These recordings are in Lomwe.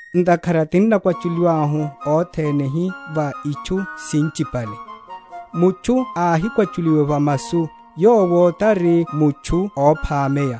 Ntakhara tinnakwachuliwahu othene hi va itchu sinchipale. Mutchu áhikwachuliwa va masu, yowo tari mutchu óphameya,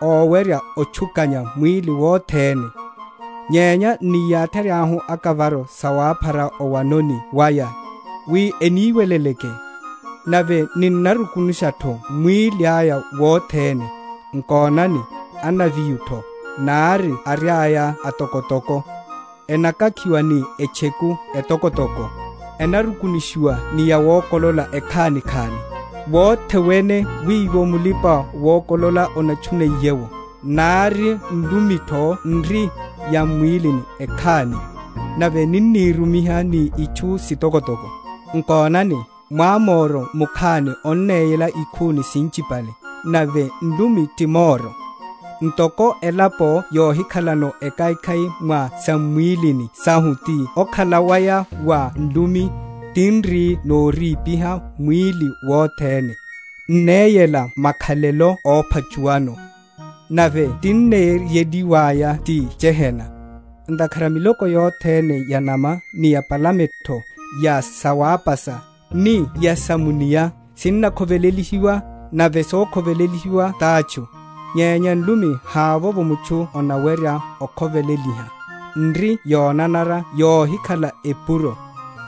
owerya otchukanya mwíli wothene. Nyenya n’niyatheryahu akavaro sawaphara owanoni waya, wi eniweleleke, nave ninnarukunushatho mwíli aya wothene. Nkonani, anaviotho, nari ariaya atokotoko, enakakhiwa ni etcheku etokotoko, enarukunushiwa ni yawokolela ekhanikhani, wothe wene wiwo mulipa‐wokolela anatchuniye’wo. Nari nlumitho n’ri yam’mwílini ekhani, nave ninnírumiha ni itchu sitokotoko. Nkonani, mwamoro mukhani onneyela ikhuni sinchipale! Nave nlumi ti moro; ntoko elapo yohikhalano ekhaikhai mwa sam’mwílini sahu ti okhala waya wa nlumi, tin’ri noripiha mwíli wothene, n’neyela makhalelo óphachuwano, nave tinneyeliwaya ti gehena. Ntakhara miloko yothene ya’nama, ni ya’palametho, ya sawapasa, ni ya sa mu’nia, sinnakhovelelihiwa, nave sokhovelelihiwa tátchu; nyenya nlumi havovo mutchu anawerya okhoveleliha; n’ri yonanara yohikhala epuro,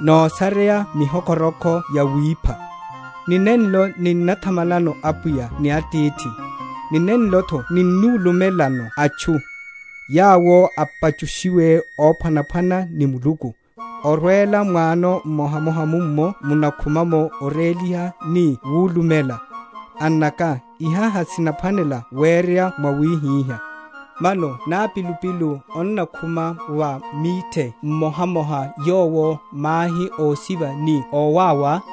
nosareya mihokhoroko yawipha. Ni nenlo ninnathamalano Apwiya ni Atithi; ni nenlotho ninnulumelano atchu, yawo apachushiwe ophwanaphwana ni Muluku; orwela mwano mmohamoha mummo munnakhuma oréliha ni wulumela. Annaka, iha hasinaphwanela wereya mwawihihá. Mano nápilupilu onnakhuma va mwithe mmohamoha yowo mahi ósiva ni ówáwa?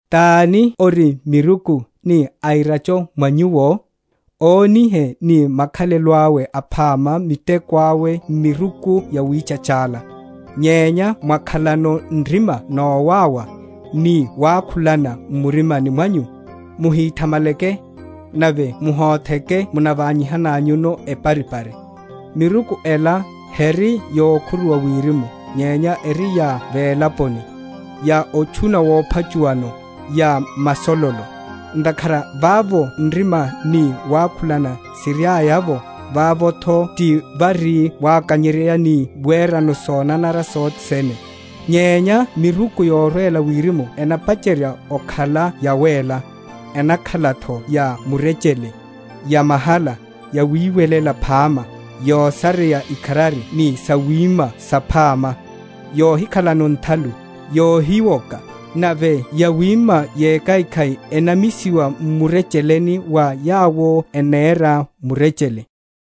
Taní ori miruku, ni airacha mwa nyuwo? Ónihe ni makhalelo awe aphama miteko awe m’miruku yawítchachala. Nyenya mwakhalano nrima nowáwa, ni wakhulana m’murima mwanyu, muhíthamaleke, nave muhotheke munaványihananyuno eparipari. Miruku ela, heri yokhuruwa wirimu, nyenya eri ya velaponi, ya otchuna wophachuwano, ya masololo. Ntakhara vavo nrima ni wakhulana siriaya’vo, vavotho ti vari wakanyeryeya ni werano sonanara sothe sene. Nyenya miruku yorwela wirimu enapacherya okhala yawéla, enakhalatho ya murechele, yamahala, yawiwelela phama, yosareya ikharari ni sawima saphama, yohikhalano nthalu, yohiwoka. Nave yawima yekhaikhai enamisiwa m’murecheleni wa yawo enera murechele.